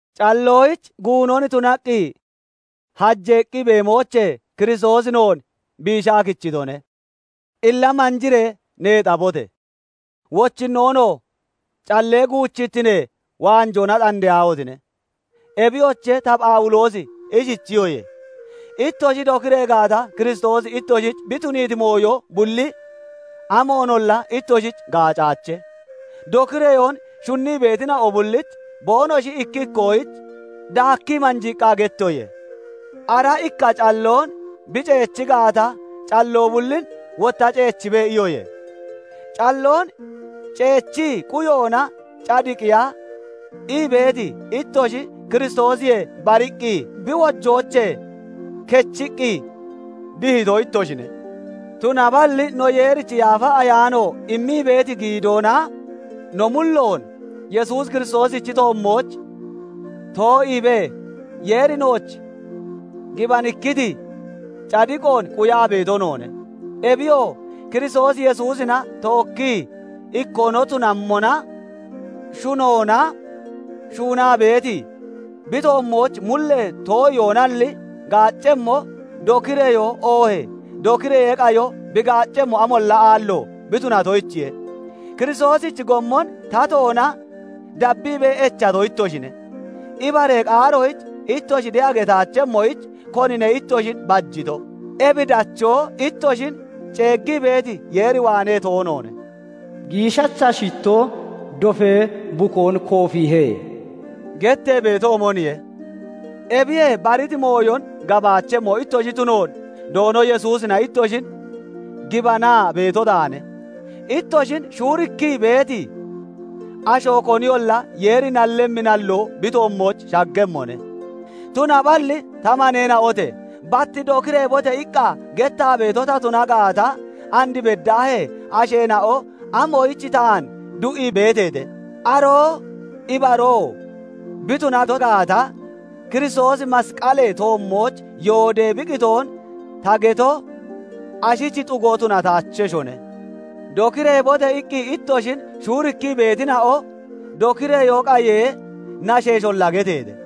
Calloyich guunon tunaa hajeeqqi beemoochee Kiristoosi noon biishaa kichitone. Illa manjiree neexabote! Wochinnoonoo callee guuchittinee waanjoona xandeyaahotine! Ebiyoche, ta Phawuloosi ishichiyoye; ittoshi dokiree gaata, Kiristoosi ittoshich bi tuniiti mooyo bulli amoonolla ittoshich gaacaache. Dokireyoon shunnii beetina'o bullich boonoshi ikki ikkoyich daakkii manjiiqqa gettoye; "Ara ikka calloon bi ceechi gaata, calloo bullin wotta ceechibe" iyoye. Calloon ceechii quyoona cadiqiya ii beeti ittoshi Kiristoosiyee bariqqi, bi wojoochee kechiqqi dihito ittoshine. Tunaballi no Yeerichi Yaafa Ayaano immii beeti giidoona no mulloon Yesuus Kiristoosichi toommooch too'iibee Yeeri nooch gibanikkiti cadiqoon quyaa beeto noone. Ebiyoo, Kiristoos Yesuusina tookkii ikkoo no tunammona, shunoona shuunaa beeti, bi toommooch mullee too'iyoalli gaaccemmo, dokireyoo oohee dokireyee qayo bi gaaccemmo amolla aallo bi tunatoyichiye. Kiristoosichi gommon tatoona dabbiibee echato ittoshine. Ibaree qaaroyich ittoshi de'a getaachemmoyich konine ittoshin bajito? Ebi dachoo ittoshin ceeggii beeti Yeer waanee toonoone. "Giishasha shittoo dofee bukoon koofiihe" gettee beetoomoniye. Ebiyee bariti mooyon gabaachemmo ittoshi tunoon Doono Yesuusina ittoshin gibanaa beeto taane; ittoshin shuurikkii beeti asho koniyolla Yeeri nallemmi nalloo bi toommooch shaggemmone. Tunaballi ta maneena'ote! Bat "Dokireebote!" iqqa gettaa beeto ta tuna gaata, and beddaahee asheena'o amoyich taan du'ii beeteete? Aroo ibaroo bi tunato gaata, Kiristoosi masqalee toommooch yoodee bi qitoon ta geto ashich xugo tunataacheshone. "Dokireebote!" iqqi ittoshin shuurikkii beetina'o dokireyoo qayee nasheesholla getteete.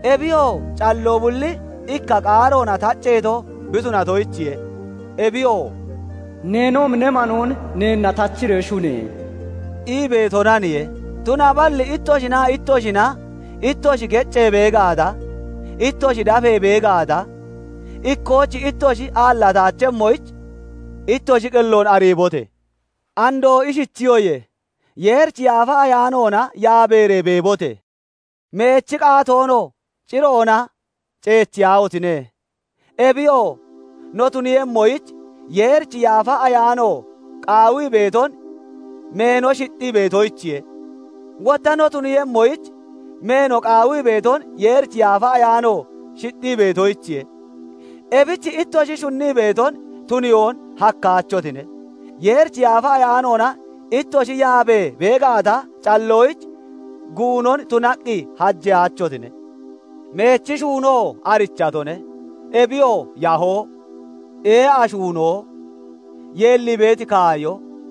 Ebiyoo, calloo bulli ikka qaaroona tacceeto bi tunatoyichiye; ebiyoo "Neenoomi ne manoon neenna tachiree shune!" ii beetonaniye. Tunaballi ittoshinaa ittoshina ittoshi geccee bee gaata, ittoshi dafee bee gaata, ikkooch ittoshi aallataachemmoyich ittoshi qelloon ariibote! Andoo ishichiyoye; Yeerichi Yaafa Ayaanoona yaabeeree beebote! Meechi qaatoonoo ciroona ceechiyaahotine! Ebiyoo, no tuniiyemmoyich Yeerichi Yaafa Ayaano qaawii beeton meeno shixxii beetoyich, wotta no tuniiyemmoyich meeno qaawii beeton Yeerichi Yaafa Ayaano shixxii beetoyichiye. Ebich ittoshi shunnii beeton tuniyoon hakkaachotine. Yeerichi Yaafa Ayaanoona ittoshi yaabee bee gaata, calloyich guunon tunaqqi hajeyaachotine. Meechi shuunoo arichatone; ebiyoo yahoo, ee'a shuunoo, yeellii beeti kaayo,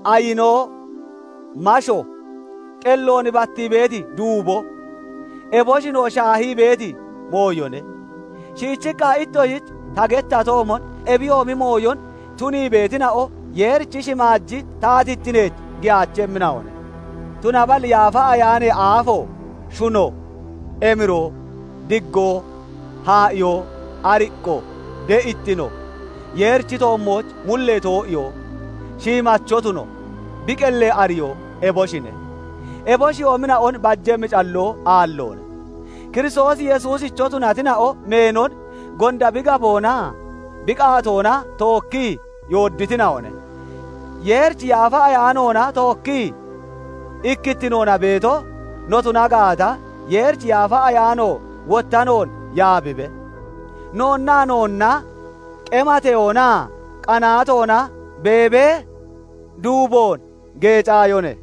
ayinoo, masho, qelloon battii beeti duubo, eboshinoo shaahii beeti mooyone. Shiichiqqa ittoshich ta gettatoomon, ebiyoomi mooyon tunii beetina'o Yeerichi shimaaji taatittineech giyaachemmina'one. Tunaballi Yaafa Ayaanee aafo, shuno, emiroo, diggoo, haa'iyoo, ariqqo, de'ittino, Yeerichi toommooch mullee too'iyoo, shiimacho tuno, bi qellee ariyoo, eboshine. Eboshiyoomina'on bajemmi calloo aalloone. Kiristoos Yesuusicho tunatina'o meenon gonda bi gaboonaa bi qaatoona tookkii yoodditina'one. Yeerichi Yaafa Ayaanoona tookkii ikkittinoona beeto no tuna gaata, Yeerichi Yaafa Ayaano wotta noon yaabibe. Noonnaa noonna qemateyoonaa qanaatoona beebee duuboon geecaayone.